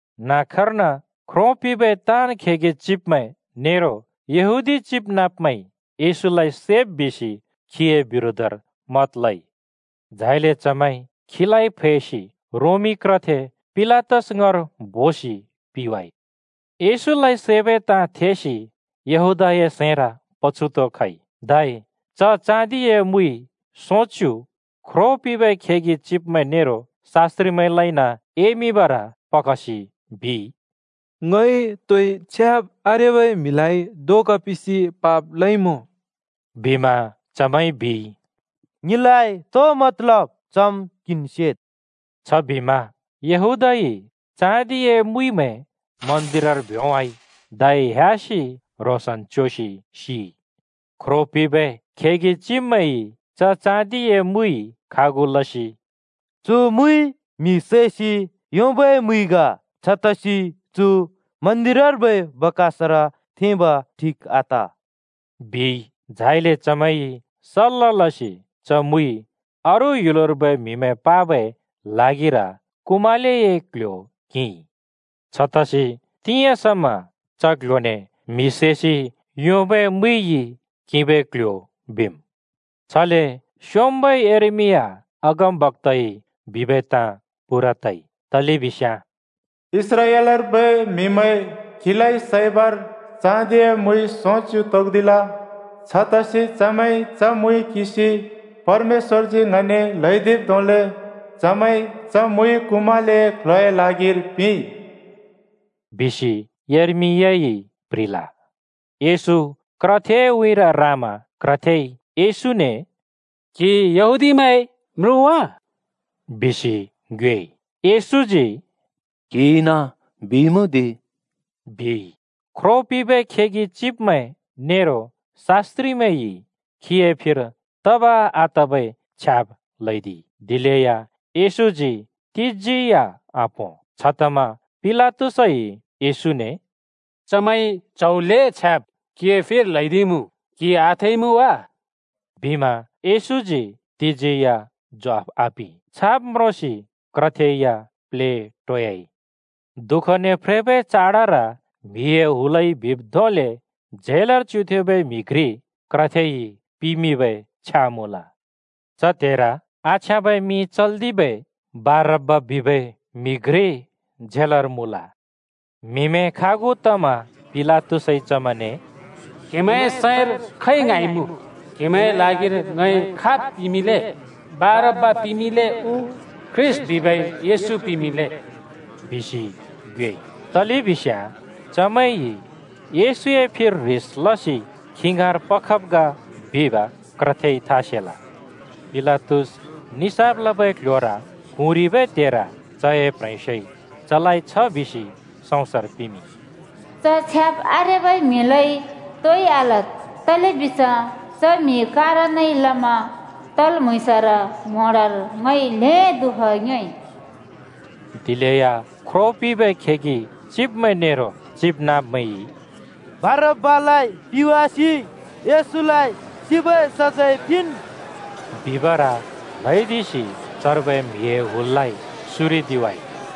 न्‍हाँक्‍कर्न, ख्रो पिंबै ताँन् खेगि चिब्मैं नेरो यहूदी चिबनाँब्मैंइ येशूलाइ सैब् बिसि खीए बिरोधर मत लइ। झाइले चमैंइ खीलाइ फैसि रोमी क्रथे पिलातस ङाँर बोसि पिंवाइ। येशूलाइ सैबै ताँ थेसि यहूदाए सैंर पछुत खइ, धै च चाँदिए मुइ सोंच्‍यु ख्रो पिंबै खेगि चिब्मैं नेरो शास्‍त्रिमैंलाइन एमिंबर पखसि बिइ, “ङइ तोइ छ्याब् आरेबै म्‍हिलाइ धोका पिंसि पाप लइमुँ।” बिमा चमैंइ बिइ, “ङिलाइ तो मतलब? चम् क्‍हिन् सेद्।” छबिमा यहूदाइ चाँदिए मुइमैं मन्दिरर भ्‍योंवाइ, धै ह्‍यासि ह्रोंसन् च्‍योसि सिइ। ख्रो पिंबै खेगि चिब्मैंइ च चाँदिए मुइ खागु लसि “चु मुइ म्‍हि सैसि योंबै मुइ ग। छतसि चु मन्दिरर्बै बाकसर थेंब ठिक आत,” बिइ। झाइले चमैंइ सल्‍ला लसि च मुइ अरू ह्‍युलर्बै म्हिमैं पाबै ल्हागिर कुमालेए क्ल्ह्‍यो किंइ। छतसि तिंयाँ समा च क्‍ल्‍ह्‍योने “म्हि सैसि योंबै मुइइ किंबै क्ल्ह्‍यो” बिम्। छले स्‍योंम्‍बै यर्मिया अगमबक्‍ताइ बिबै ताँ पूरा तइ, तलेबिस्याँ “इस्राएलर्बै म्‍हिमैंइ खीलाइ सैबर चाँदिए मुइ सोंच्‍यु तोक्दिल। छतसि चमैंइ च मुइ किंसि, परमेश्‍वरजी ङने ल्हैदिब् धोंले चमैंइ च मुइ कुमालेए क्ल्ह्‍योए ल्हागिर पिंइ,” बिसि यर्मियाइ प्‍ह्रिल। येशू क्रथेए उँइँर रामा क्रथेइ येशूने “क्‍हि यहूदीमैंए म्रुँ वा?” बिसि ङ्योएइ। येशूजी “क्‍हिइन बिइमुँ दि,” बिइ। ख्रो पिंबै खेगि चिब्मैं नेरो शास्‍त्रिमैंइ खीए फिर तब आतबै छ्याब् ल्‍हैदिइ, दिलेया येशूजी तिजी या आपों। छतमा पिलातसइ येशूने “चमैंइ च्‍हौ ल्‍हें छ्याब् क्‍हिए फिर ल्‍हैदिइमुँ, क्‍हिइ आथेइमुँ वा?” बिमा येशूजी तिजी या ज्वाफ आपिं। छाब् म्रोंसि क्रथे या प्लेटोयाइ। दुःखने फ्रेबै चाडर म्‍हिए हुलइ बिब् धोंले झेलर च्युथेंबै म्हि घ्रि क्रथेइ पिमिंबै छ्या मुँल। च त्हेर आछ्याँबै मिं चल्दिबै बारब्‍बा बिबै म्हि घ्रि झेलर मुँल। म्‍हिमैं खागु तमा पिलातसइ चमैंने “क्हेमैंए सैंर खै ङ्हाँइमुँ? क्हेमैंए ल्हागिर ङइ खाब् पिमिंले? बारब्‍बा पिमिंले उ ख्रीष्‍ट बिबै येशू पिमिंले?” बिसि ङ्योएइ। तलेबिस्याँ चमैंइ येशूए फिर ह्रिस लसि खी ङाँर पखब् ग बिब क्रथेइ था सेल। पिलातस निसाफ लबै क्‍ल्‍ह्‍योर क्हुँरिबै त्हेर चए प्ह्रेंस्योइ चलाइ छ बिसि सउँसर पिमिंइ, “च छ्याब् आरेबै म्‍हिलाइ तोइ आलद्, तलेबिस्याँ च म्‍हिए कारणइ लमा तल् म्‍हुँइँसर म्‍होंडर ङइ ल्‍हें दुःख योंइ।” दिलेया ख्रो पिंबै खेगि चिब्मैं नेरो चिबनाँब्मैंइ “बारब्‍बालाइ पिवासि येशूलाइ सिबै सजैं पिंन्!” बिबर ल्हैदिसि चर्बै म्हिए हुललाइ सुरिदिवाइ।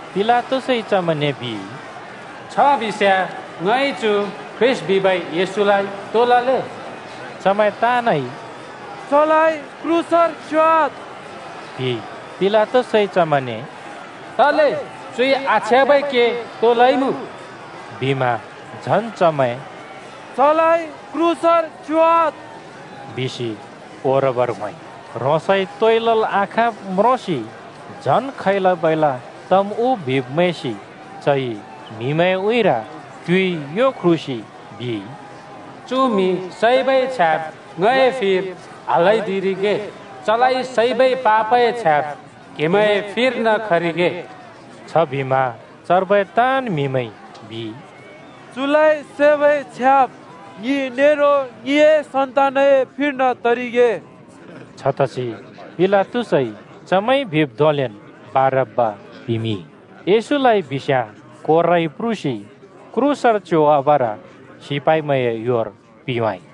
पिलातसइ चमैंने बिइ, “छबिस्याँ ङइ चु ख्रीष्‍ट बिबै येशूलाइ तो लले दि?” चमैं ताँनइ “चलाइ क्रूसर च्योवाद्,” बिइ। पिलातसइ चमैंने “तले? चुइ आछ्याँबै के तो लइमुँ?” बिमा झन् चमैं “चलाइ क्रूसर च्योवाद्,” बिसि ओरबर होंइ। ह्रोंसइ तोइ लल् आखाँब् म्रोंसि झन् खैला-बैला तम् उ बिब् मैंसि चइ म्‍हिमैंए उँइँर क्‍युइ यो ख्रुसि बिइ, “छबिस्याँ चु म्‍हि सैबै छ्याब् ङए फिर आल्‍हैदिरिगे। चलाइ सैबै पापए छ्याब् क्‍हेमैंए फिर्न खरिगे।” छबिमा चर्बै ताँन् म्हिमैंइ बिइ, “चुलाइ सैबै छ्याब् ङि नेरो ङिए सन्‍तानए फिर्न तरिगे।” छतसि पिलातसइ चमैंइ बिब् धोंलेन् बारब्‍बा पिमिंइ, येशूलाइ बिस्याँ कोराइ प्रुसि क्रूसर च्‍योवाबर सिपाइमैंए योर पिंवाइ।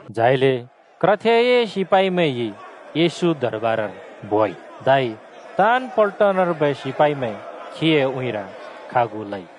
झाइले क्रथेए सिपाइमैंइ येशू दरबारर बोइ, धै ताँन् पल्टनर्बै सिपाइमैं खीए उँइँर खागु लइ।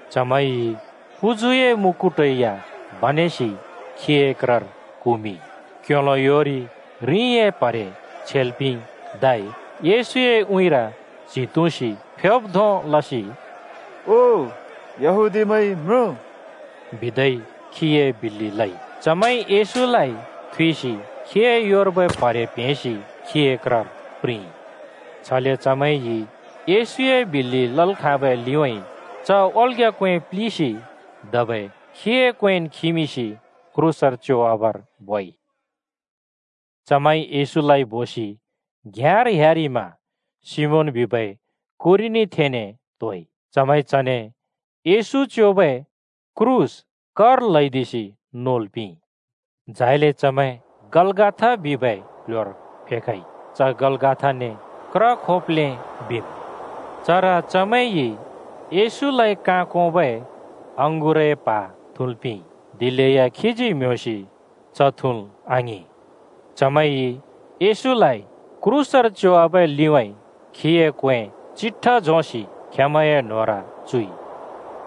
चमैंइ पुजुए मुकुट या बनेसि खीए क्रर कुमिंइ, क्‍योलो योरि रिंए प्‍हरे छेल् पिंइ, धै येशूए उँइँर च्‍हि तुँसि फ्योब् धों लसि “ओ येहूदिमैंए म्रुँ!” बिदै खीए बिल्‍लि लइ। चमैंइ येशूलाइ थुइसि खीए योर्बै प्‍हरे प्‍हेंसि खीए क्रर प्रिंइ। छले चमैंइ येशूए बिल्‍लि लल् खाँबै लिउँइँ च ओल्‍ग्‍या क्‍वें प्‍लिसि धबै खीए क्‍वेंन् खिमिंसि क्रूसर च्योवाबर बोइ। चमैंइ येशूलाइ बोसि घ्‍याँर ह्‍यारिमा सिमोन बिबै कुरेनीथेंने त्‍होइ, चमैंइ चने येशू च्‍योबै क्रूस कर ल्‍हैदिसि नोल् पिंइ। झाइले चमैं गलगथा बिबै क्‍ल्‍ह्‍योर फेखइ। च गलगथाने क्र खोप्‍लें बिम्। चर चमैंइ येशूलाइ काँ कोंबै अँगुरए प्हा थुँल् पिंइ, दिलेया खीजी म्ह्‍योंसि च थुँल् आङिं। चमैंइ येशूलाइ क्रूसर च्योवाबै लिउँइँ खीए क्‍वें चिट्ठा झोंसि खेंमैंए न्होंर चुइ।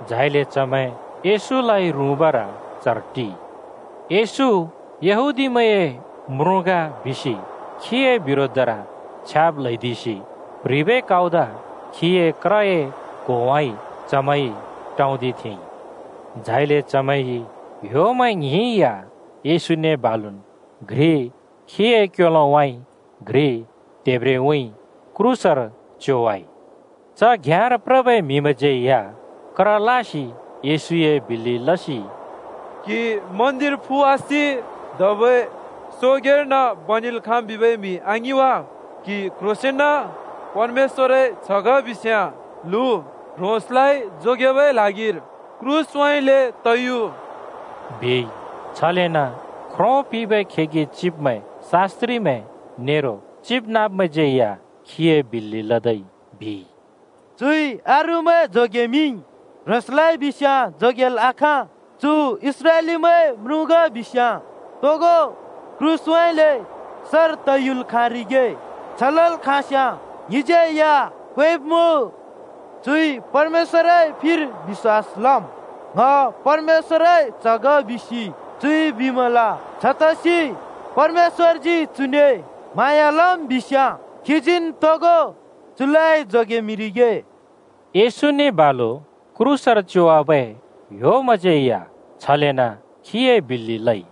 झाइले चमैं येशूलाइ रुँबर चर टिइ। “येशू यहूदीमैंए म्रुँ ग बिसि खीए बिरोधर छ्याब् ल्हैदिसि प्ह्रिबै काउद खीए क्रए क्होउँइँ चमैंइ टौंदिथेंइ।” झाइले चमैंइ ह्‍योमैं ङ्हिं या येशूने बालुन् घ्रि खीए क्‍योलोउँइँ घ्रि त्हेब्रेउँइँ क्रूसर च्योवाइ। च घ्‍याँर प्रबै म्‍हिमैंज्यै या क्र लासि येशूए बिल्‍लि लसि “क्हि मन्दिर फुवासि धबै सोंगैंर्न बनेल् खाँम् बिबै म्‍हि, आङिं वा? क्‍हि क्‍ह्रोंसेंन परमेश्‍वरए च्‍ह ग बिस्‍याँ लु, ह्रोंसलाइ जोगेबै ल्हागिर क्रूसउँइँले त यु!” बिइ। छलेन ख्रो पिंबै खेगि चिब्मैं, शास्‍त्रिमैं नेरो चिबनाँब्मैंज्यै या खीए बिल्‍लि लदै बिइ, “चुइ अरूमैं जोगेमिंइ, ह्रोंसलाइ बिस्‍याँ जोगेल् आखाँ। चु इस्राएलीमैंए म्रुँ ग बिस्‍याँ तोगो क्रूसउँइँले सर तयुल् खाँरिगे। छ लल् खाँस्‍याँ ङिज्यै या क्वेंब्मुँ। चुइ परमेश्‍वरए फिर बिश्‍वास लम्, ‘ङ परमेश्‍वरए च्‍ह ग,’ बिसि चुइ बिमल। छतसि परमेश्‍वरजी चुने म्हाँया लम् बिस्याँ खीजीन् तोगो चुलाइ जोगेमिंरिगे।” येशूने बालु क्रूसर च्योवाबै ह्‍योमैंज्यै या छलेन् खीए बिल्‍लि लइ।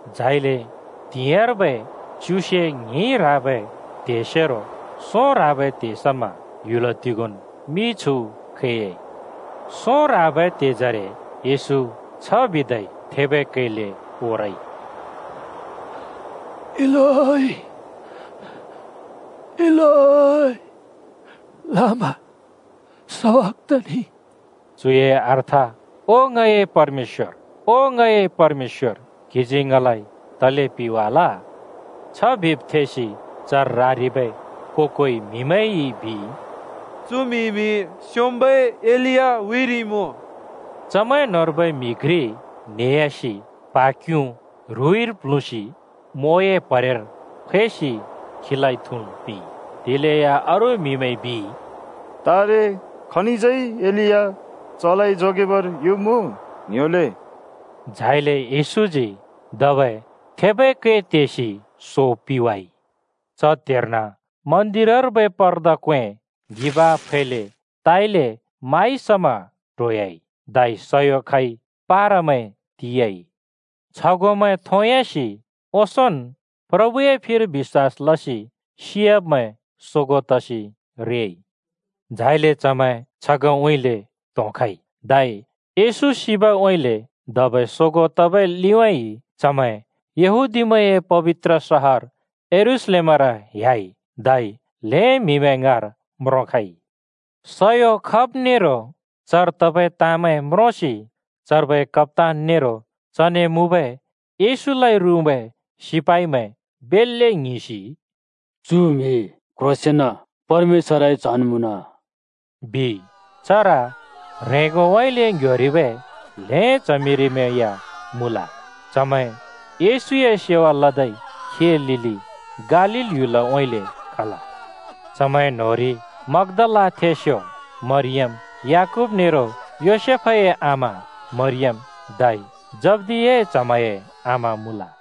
झाइले त्हिंयाँर्बै च्युसे ङ्हिं ह्राबै त्हेसेरो सों ह्राबै त्हे समा ह्‍युल तिगोंन् मिछु खैयाइ। सों ह्राबै त्हेजरे येशू छ बिदै थेबै कैले ओरइ, “इलोइ, इलोइ, लामा सबखथनि?” (चुए अर्थ “ओ ङए परमेश्‍वर, ओ ङए परमेश्‍वर, क्‍हिजी ङलाइ तले पिवाल?”) छ बिब् थेसि चर रारिबै को-कोइ म्हिमैंइ बिइ, “चु म्हिइमि स्‍योंम्‍बै एलिया हुरिइमुँ।” चमैं न्‍होंर्बै म्‍हि घ्रि न्हेह्‍यासि प्हा क्युँ ह्रुइर प्ल्हुँसि म्वोए प्हरेर फैसि खीलाइ थुँल् पिंइ। दिलेया अरू म्‍हिमैंइ बिइ, “तारे, खनिज्यै एलिया चलाइ जोगेबर युम् उ? ङ्‍ह्‍योले!” झाइले येशूजी धबै थेबै कै तेसि सो पिवाइ। च त्हेर्न मन्दिरर्बै पर्दा क्‍वें ङ्हिबाँ फैले ताइले माइ समा ट्होह्‍याइ, धै सयो खइ, पारामैं तियाइ। छगोंमैं थोंयासि ओंसोंन् प्रभुए फिर बिश्‍वास लसि सियाब्मैं सोगों तसि रेइ। झाइले चमैं छगोंउँइँले त्होंखइ, धै येशू सिबउँइँले धबै सोगों तबै लिउँइँ चमैं यहूदीमैंए पबित्र सहर यरूशलेमर ह्‍याइ धै ल्‍हें म्‍हिमैं ङाँर म्रोंखइ। सयो खब नेरो चर तबै ताँमैं म्रोंसि चर्बै कप्‍तान नेरो चने मुँबै येशूलाइ रुँबै सिपाइमैं बेल्‍ले ङ्हिंसि “चु म्‍हि क्‍ह्रोंसेन परमेश्‍वरए च्‍हन् मुँन,” बिइ। चर ह्रेंगोउँइँले ङ्‌ह्‍योरिबै ल्‍हें च्हमिरिमैं या मुँल। चमैं येशूए सेवा लदै खीए लिलि गालील ह्‍युलउँइँले खल। चमैं न्‍होंरि मग्दालाथेंस्यो मरियम, याकूब नेरो योसेफए आमा मरियम, धै जब्दियाए च्हमैंए आमा मुँल।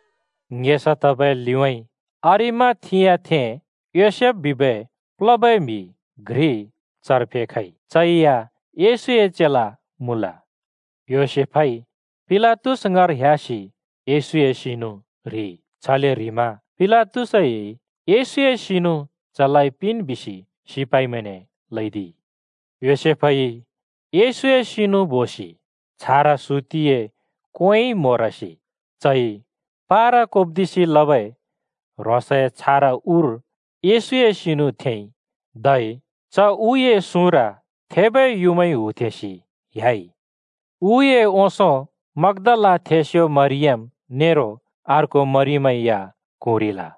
ङेसा तबै लिउँइँ अरिमाथियाथें योसेफ बिबै प्लबै म्‍हि घ्रि चर फेखइ। चै या येशूए चेला मुँल। योसेफइ पिलातस ङाँर ह्‍यासि येशूए सिनु ह्रिइ, छले ह्रिमा पिलातसइ येशूए सिनु चलाइ पिन् बिसि सिपाइमैंने ल्‍हैदिइ। योसेफइ येशूए सिनु बोसि छारा सुतिए क्‍वेंइ म्होरसि, चइ पारा कोप्‍दिसि लबै ह्रोंसए छारा उर येशूए सिनु थेंइ, धै च उए सुँर थेबै युँमाइ हुथेंसि ह्‍याइ। उए ओंसों मग्‍दालाथेंस्‍यो मरियम नेरो अर्को मरियम या क्हुँरिल।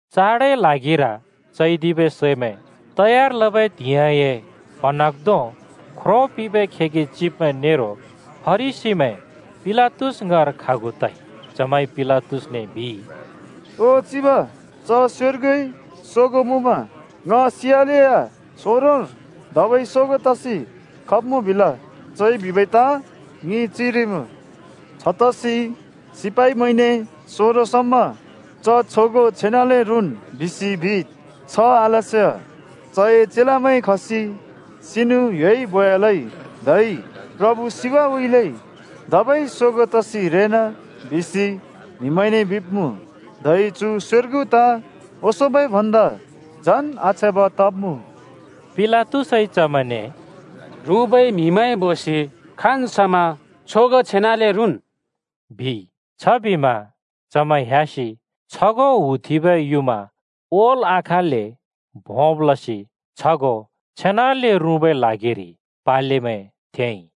चाडए ल्हागिर चैदिबै सैमैं तयार लबै त्हिंइए प्हाँन्हाँग्धों ख्रो पिंबै खेगि चिब्मैं नेरो फरिसीमैं पिलातस ङाँर खागु तइ। चमैंइ पिलातसने बिइ, “ओ चिब, च स्योर्गुइ सोगों मुँमा ‘ङ सियालेया सोंरोंर धबै सोगों तसि खब्मुँ’ बिल। चइ बिबै ताँ ङिइ चिरिइमुँ। छतसि सिपाइमैंने सोंरों समा ‘च छगों छेनाले रुँन्,’ बिसि बिद्। छ आलस्याँ चए चेलामैं खसि सिनु ह्‍योइ बोयालै धै ‘प्रभु सिबउँइँले धबै सोगों तसि रेना’ बिसि म्‍हिमैंने बिब्‍मुँ। धै चु स्योर्गु ताँ ओंसोंबै भन्दा झन् आछ्याँब तब्मुँ।” पिलातसइ चमैंने “रुँबै म्हिमैं बोसि खाँन् समा छगों छेनाले रुँन्,” बिइ। छबिमा चमैं ह्‍यासि छगों हुथेंबै युँमा ओल् आखाँल्‍ले भोंब् लसि छगों छेनाले रुँबै ल्हागिरि पालेमैं थेंइ।